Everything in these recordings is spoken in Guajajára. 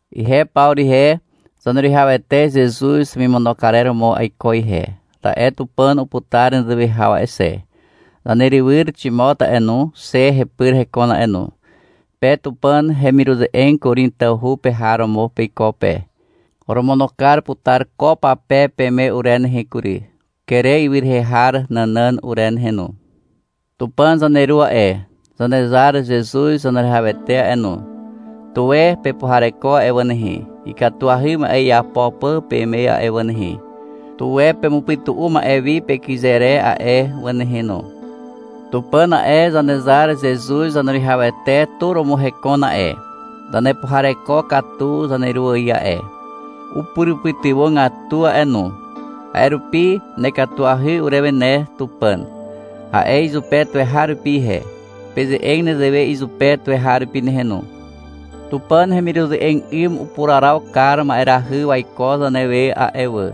Ihe Pawru ihe. Zaneruwihawete Zezuz hemimono karer romo aiko ihe, ta'e Tupàn uputar nezewe haw a'e xe. Zanerywyr Ximot a'e no, xe hepyr hekon a'e no. Pe Tupàn hemiruze'eg Korin tawhu pe har romo peiko pe. Oromono kar putar ko pape peme ure nehe kury, Kere ywy rehe har nànàn ure nehe no. Tupàn zaneru a'e, Zanezar Zezuz Zaneruwihawete a'e no, tuwe pepuhareko a'e wà nehe, ikatuahy ma'e iapo pà peme a'e wà nehe. Tuwe pemupytu'u ma'e wi pekyze re a'e wà nehe no. Tupàn a'e, Zanezar Zezuz Zaneruwihawete tu romo hekon a'e. Zanepuhareko katu zaneru ài a'e. Upurupytywàgatu a'e no. A'e rupi — Nekatuahy urewe ne Tupàn, a'e izupe tuweharupi ihe. Peze'eg nezewe izupe tuweharupi nehe no. Tupàn hemiruze'eg 'ym upuraraw kar ma'erahy waiko zanewe a'e wà,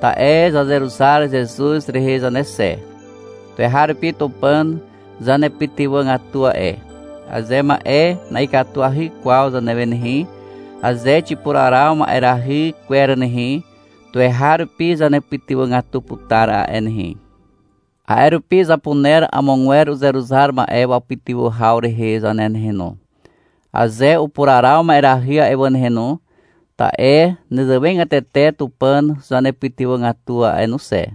ta'e zazeruzar Zezuz rehe zane xe. Tuweharupi Tupàn zanepytywàgatu a'e. Aze ma'e na'ikatuahy kwaw zanewe nehe, aze xipuraraw ma'erahy kwer nehe, tuweharupi zanepytywàgatu putar a'e nehe. A'e rupi zapuner amogwer uzeruzar ma'e wapytywà haw rehe zane nehe no, aze upuraraw ma'erahy a'e wà nehe no, ta'e nezewegatete Tupàn zanepytywàgatu a'e no xe.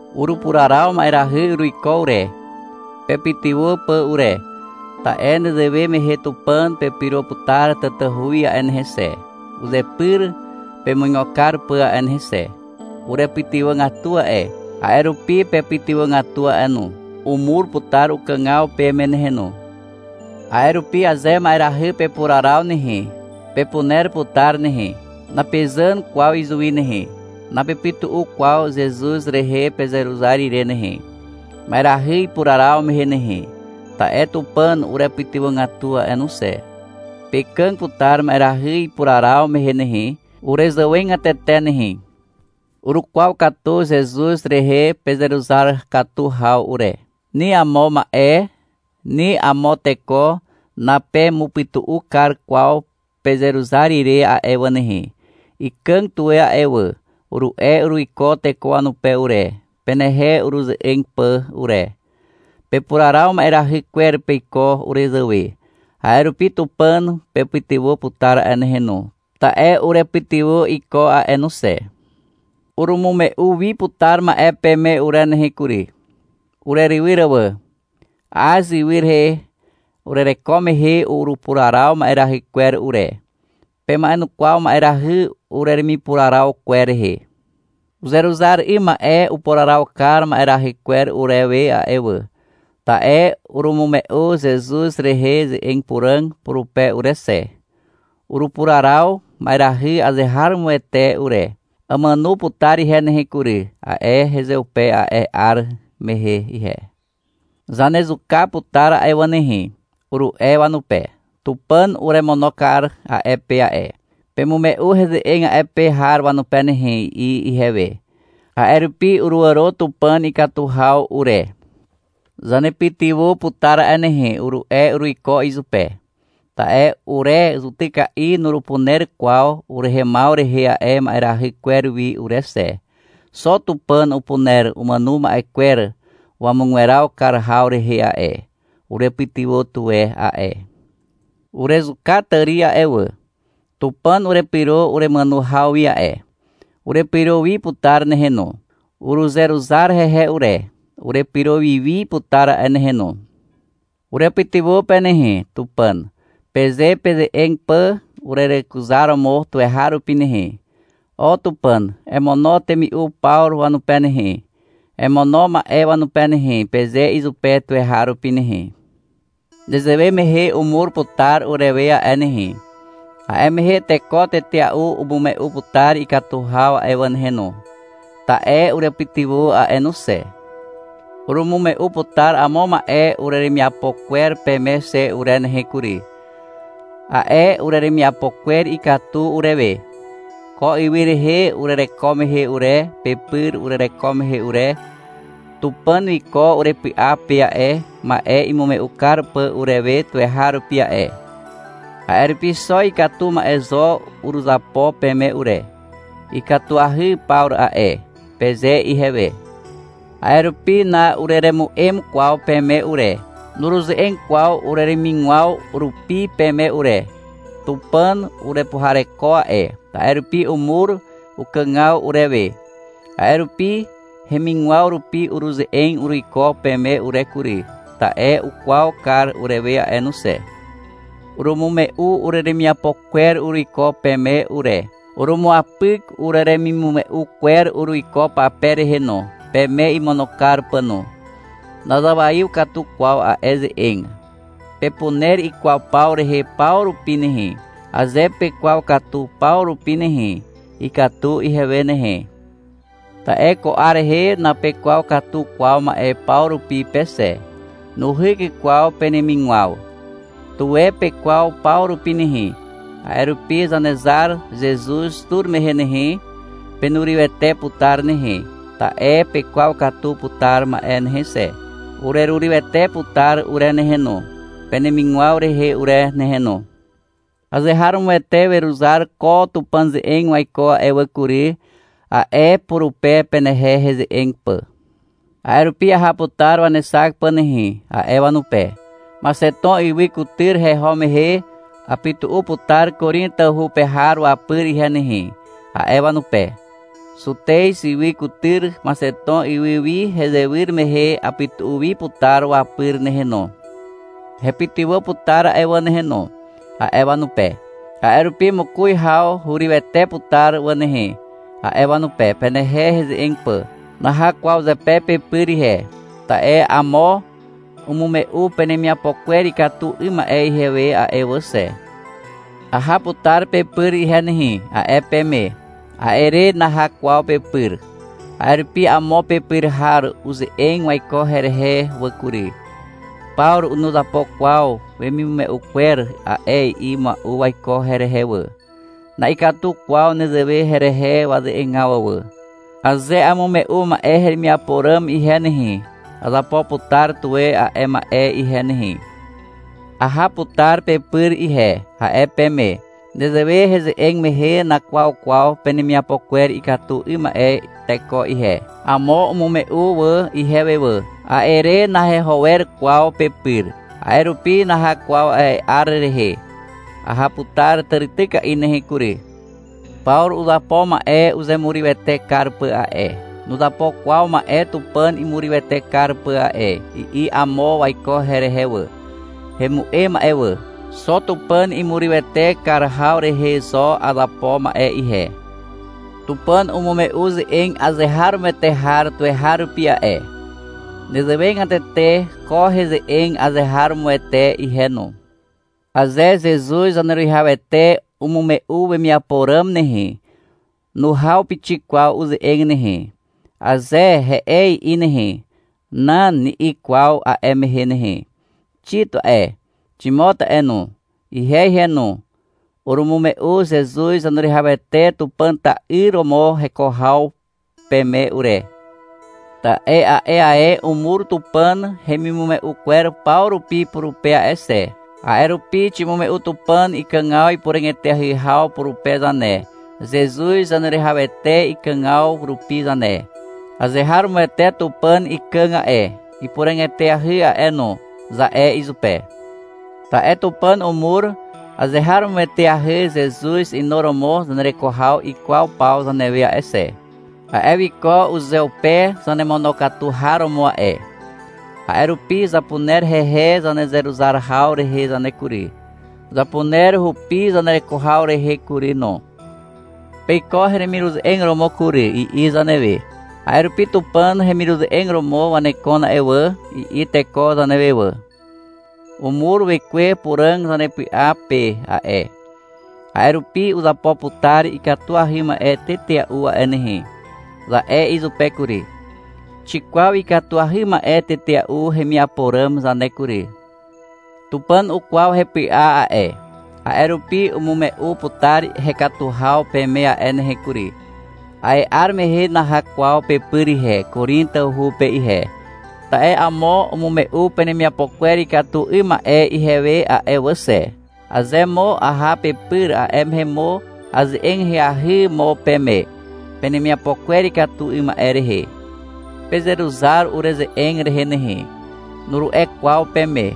Urupuraraw ma'erahy uruiko ure, pepytywà pà ure. Ta'e nezewe mehe Tupàn pepyro putar tatahu wi a'e nehe xe, uzepyr pemuigo kar pà a'e nehe xe. Urepytywàgatu a'e, a'e rupi pepytywàgatu a'e no. Umur putar ukàgaw peme nehe no. A'e rupi aze ma'erahy pepuraraw nehe, pepuner putar nehe. Napezàn kwaw izuwi nehe. Napepytu'u kwaw Zezuz rehe pezeruzar ire nehe, ma'erahy ipuraraw mehe nehe. Ta'e Tupàn urepytywàgatu a'e no xe. Pekàg putar ma'erahy ipuraraw mehe nehe, urezàwegatete nehe. Urukwaw katu Zezuz rehe pezeruzar katu haw ure. Ni amo ma'e, ni amo teko napemupytu'u kar kwaw pezeruzar ire a'e wà nehe. — Ikàg tuwe a'e wà, uru'e uruiko teko wanupe ure, penehe ureze'eg pà ure. Pepuraraw ma'erahy kwer peiko urezàwe. A'e rupi Tupàn pepytywà putar a'e nehe no, ta'e urepytywà iko a'e no xe. Urumume'u wi putar ma'e peme ure nehe kury, urerywyr wà. Az ywy rehe urereko mehe urupuraraw ma'erahy kwer ure. Pema'enukwaw ma'erahy ureremipuraraw kwer rehe. Uzeruzar 'ym ma'e upuraraw kar ma'erahy kwer urewe a'e wà, ta'e urumume'u Zezuz rehe ze'eg puràg purupe ure xe. Urupuraraw ma'erahy azeharomoete ure. — Amàno putar ihe nehe kury, a'e hezeupe a'e 'ar mehe ihe. — Zanezuka putar a'e wà nehe, uru'e wanupe. Tupàn uremono kar a'e pe a'e. Pemume'u heze'eg a'e pe har wanupe nehe, i'i ihewe. A'e rupi uruàro Tupàn ikatu haw ure. — Zanepytywà putar a'e nehe, uru'e uruiko izupe. Ta'e ure zutyka'i nurupuner kwaw urehemaw rehe a'e ma'erahy kwer wi ure xe. Xo Tupàn upuner umàno ma'e kwer wamugweraw kar haw rehe a'e. Urepytywà tuwe a'e. Urezuka tàri a'e wà. Tupàn urepyro uremàno haw wi a'e. Urepyro wi putar nehe no. Uruzeruzar hehe ure. Urepyro wi wi putar a'e nehe no. Urepytywà pe nehe, Tupàn, peze peze'eg pà urerekuzaromo tuweharupi nehe. — O Tupàn, emono temi'u Pawru wanupe nehe, emono ma'e wanupe nehe, peze izupe tuweharupi nehe. Nezewe mehe umur putar urewe a'e nehe. A'e mehe teko tetea'u umume'u putar ikatu haw a'e wà nehe no, ta'e urepytywà a'e no xe. Urumume'u putar amo ma'e ureremiapo kwer peme xe ure nehe kury. A'e ureremiapo kwer ikatu urewe. Ko ywy rehe urereko mehe ure, pepyr urereko mehe ure, Tupàn wiko urepy'a pe a'e, ma'e imume'u kar pà urewe tuweharupi a'e. A'e rupi xo ikatu ma'e zo uruzapo peme ure. (— Ikatuahy Pawru a'e, peze ihewe.) A'e rupi na'ureremu'em kwaw peme ure. Nuruze'eg kwaw ureremigwaw rupi peme ure. Tupàn urepuhareko a'e. A'e rupi umur ukàgaw urewe. A'e rupi hemigwaw rupi uruze'eg uruiko peme ure kury, ta'e ukwaw kar urewe a'e no xe. Urumume'u ureremiapo kwer uruiko peme ure. Urumuapyk ureremimume'u kwer uruiko pape rehe no, peme imono kar pà no. Nazawaiw katu kwaw a'e ze'eg. Pepuner ikwaw paw rehe paw rupi nehe. Aze pekwaw katu paw rupi nehe, ikatu ihewe nehe. Ta'e ko 'ar rehe napekwaw katu kwaw ma'e paw rupi pe xe. Nuhyk kwaw penemigwaw. Tuwe pekwaw paw rupi nehe. A'e rupi Zanezar Zezuz tur mehe nehe, penurywete putar nehe, ta'e pekwaw katu putar ma'e nehe xe. Urerurywete putar ure nehe no, penemigwaw rehe ure nehe no. — Azeharomoete weruzar ko Tupàn ze'eg waiko a'e wà kury, a'e purupe, penehe heze'eg pà. — A'e rupi aha putar wanexak pà nehe, a'e wanupe. — Maxeton ywy kutyr heho mehe, apytu'u putar Korin tawhu pe har wapyr ihe nehe, a'e wanupe. Zutez ywy kutyr Maxeton ywy wi hezewyr mehe apytu'u wi putar wapyr nehe no. Hepytywà putar a'e wà nehe no, a'e wanupe. — A'e rupi mokoz haw hurywete putar wà nehe, a'e wanupe, penehe heze'eg pà. Naha kwaw zepe pepyr ihe. (Ta'e amo umume'u penemiapo kwer ikatu 'ym ma'e ihewe a'e wà xe.) — Aha putar pepyr ihe nehe, a'e peme. A'e re naha kwaw pepyr. A'e rupi amo pepyr har uze'eg waiko herehe wà kury. — Pawru nuzapo kwaw wemimume'u kwer a'e, i'i mua'u waiko herehe wà. Na'ikatu kwaw nezewe herehe waze'egaw wà. Aze amume'u ma'e heremiapo ràm ihe nehe, azapo putar tuwe a'e ma'e ihe nehe. — Aha putar pepyr ihe, a'e peme. Nezewe heze'eg mehe nakwaw kwaw penemiapo kwer ikatu 'ym ma'e teko ihe. Amo umume'u wà ihewe wà. A'e re naheho wer kwaw pepyr. A'e rupi naha kwaw a'e 'ar rehe. Aha putar tàrityka'i nehe kury. — Pawru uzapo ma'e uzemurywete kar pà a'e. Nuzapo kwaw ma'e Tupàn imurywete kar pà a'e, i'i amo waiko herehe wà. Hemu'em a'e wà. Xo Tupàn imurywete kar haw rehe zo azapo ma'e ihe. Tupàn umume'u ze'eg azeharomoete har tuweharupi a'e. Nezewegatete ko heze'eg azeharomoete ihe no. Aze Zezuz Zaneruwihawete umume'u wemiapo ràm nehe, nuhaw pixik kwaw uze'eg nehe. Aze, — He'e, i'i nehe. — Nan, ni'i kwaw a'e mehe nehe. Xit a'e, Ximot a'e no, ihe ihe no, urumume'u Zezuz Zaneruwihawete Tupàn ta'yr romo heko haw peme ure. Ta'e a'e ae umur Tupàn hemimume'u kwer paw rupi purupe a'e xe. A'e rupi ximume'u Tupàn ikàgaw ipuràg eteahy haw purupe zane, Zezuz Zaneruwihawete ikàgaw rupi zane. — Azeharomoete Tupàn ikàg a'e, ipuràg eteahy a'e no, za'e izupe. Ta'e Tupàn umur azeharomoeteahy Zezuz inuromo zanereko haw ikwaw paw zanewe a'e xe. A'e wiko uzeupe zanemonokatu har romo a'e. A'e rupi zapuner hehe zanezeruzar haw rehe zane kury, zapuner hupi zanereko haw rehe kury no. — Peiko heremiruze'eg romo kury, i'i zanewe. A'e rupi — Tupàn hemiruze'eg romo wanekon a'e wà, i'i teko zanewe wà. Umur Wekwe Puràg zanepy'a pe a'e. A'e rupi — Uzapo putar ikatuahy ma'e tetea'u a'e nehe, za'e izupe kury. Xikwaw ikatuahy ma'e tetea'u hemiapo ràm zane kury. Tupàn ukwaw hepy'a a'e. A'e rupi umume'u putar hekatu haw peme a'e nehe kury. A'e 'ar mehe naha kwaw pepyr ihe, Korin tawhu pe ihe, ta'e amo umume'u penemiapo kwer ikatu 'ym ma'e ihewe a'e wà xe. Aze mo aha pepyr, a'e mehe mo aze'eg ahyahy mo peme, penemiapo kwer ikatu 'ym ma'e rehe. — Pezeruzar ureze'eg rehe nehe, nuru'e kwaw peme.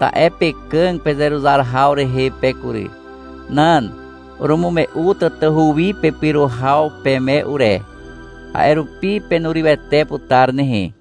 Ta'e pekàg pezeruzar haw rehe pe kury. Nan. Urumume'u tatahu wi pepyro haw peme ure. A'e rupi penurywete putar nehe.